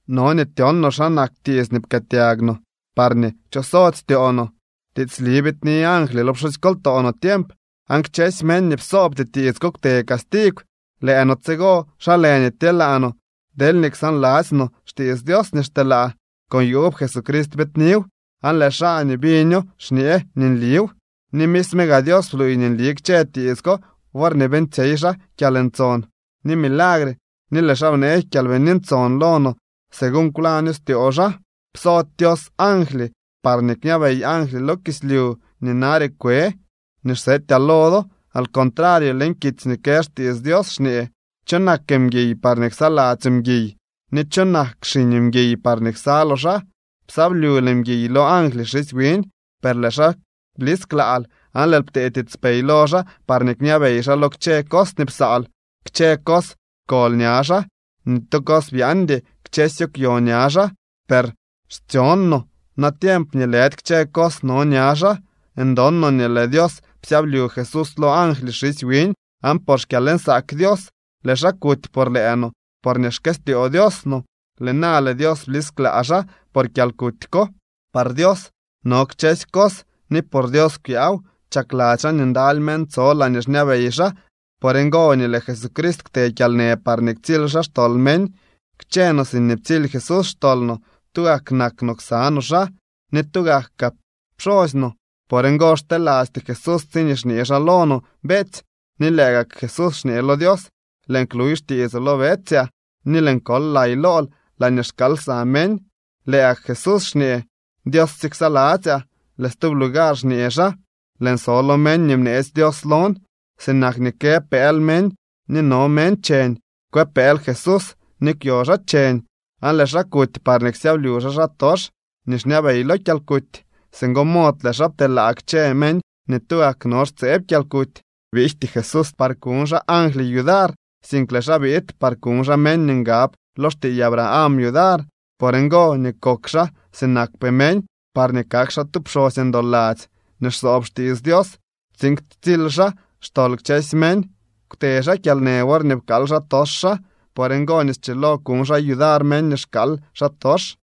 No nii tyon no xa nak tiits nii pkëëtyag no parñee kchosody styoo no. Tiitsli biidni angly lo pxusykoltoo no tiemp, aan kchësy meñ nii psoobty tiits ko kwte castigw. ¿Lëë no tsigo, xa lë nii tyeelaa no deelñee ksaanladzy no xtiits Dios nii xteelaa?, con yuub Jesucrist biidniw, aan lëë xaa nii biño xñee nii nliw. Ni misme gaa Dios bluuy nii nli kchë tiits ko worñee beeñtsyey xaa kyalntson ni milagre, ni lëë xaa bnee Kyalbini Ntson lo no según kwlañ styoo xaa. Psody Dios angly par kñabey angly lo kislyu nii nare kwe nii xsetyaa lo do. Al contrario, leñ kitsy nii kë xtiits Dios xñee: ¿Cho nak mguiy parñee ksaladzyoo mguiy? ¿Ni cho nak xiñ mguiy parñee ksaloo xaa? Psyablyul mguiy lo angly xisy wiñ, per lëë xaa blisklaal, aan lëël ptee tiitspey lo xaa parñee kñabey xaa lo kchë cos nii psaal. Kchë cos pkol ña xaa. Ni tu cos byaaldy. Kchësyo kwyo ña xaa. Per xtyon no natiemp nii lëdy kchë cos no ña xaa. Ndon no nii lëë Dios psyablyu Jesús lo angly xisy wiñ. Aan por xkyalnsaak Dios lëë xaa kuty por lëë no porñee xkëstyoo Dios no. Lëë na lëë Dios blisklaa xaa por kyalkuty ko. Par Dios no kchësy cos ni por Dios kwyaaw. Chakladzy xaa nii ndaly meñ tso laañee xñabey xaa. Por ngo nii lëë Jesucrist kwte kyalnë parñee ktsily xaa xtol meñ. Kchë no siñee ptsily Jesús xtol no, tugak nak no ksa no xaa, ni tugak kaa pxosy no. Por ngo xtelasty Jesús tsiñee xñee xaa lo no beetsy, ni lëë gak Jesús xñee lo Dios: Lëën kluy xtiitsoo lo betsyaa, ni lëën kol lay lool laañee xkaal lsa meñ. Lëë gak Jesús xñee: Dios sye ksaladzyaa. Lëë stub lugar xñee xaa: Lëën so lo meñ nii bneetsy Dios lon. Sinak nii kë pëël meñ ni no meñ cheñ, kwë pëël Jesús ni kwyo xaa cheñ. Aan lëë xaa kuty parñee ksyablyu xaa xaatox nii xñabey lo kyalkuty. Singo mod lëë xaa pteelaa kchë meñ nii tugak no xtseb kyalkuty. Biijty Jesús par kuñ xaa angly yudar, sink lëë xaa biid par kuñ xaa meñ nii ngab lo xtiiy Abraham yudar. Por ngo nii kok xaa sinakpee meñ, parñee kak xaa tu pxosy ndoladzy nii xsoob xtiits Dios, tsiin ktsily xaa xtol kchësy meñ. Kwte xaa kyalnë worñee pkaal xaatox xaa. Por ngo nii schilo kuñ xaa yudar meñ nii xkaal xaatox.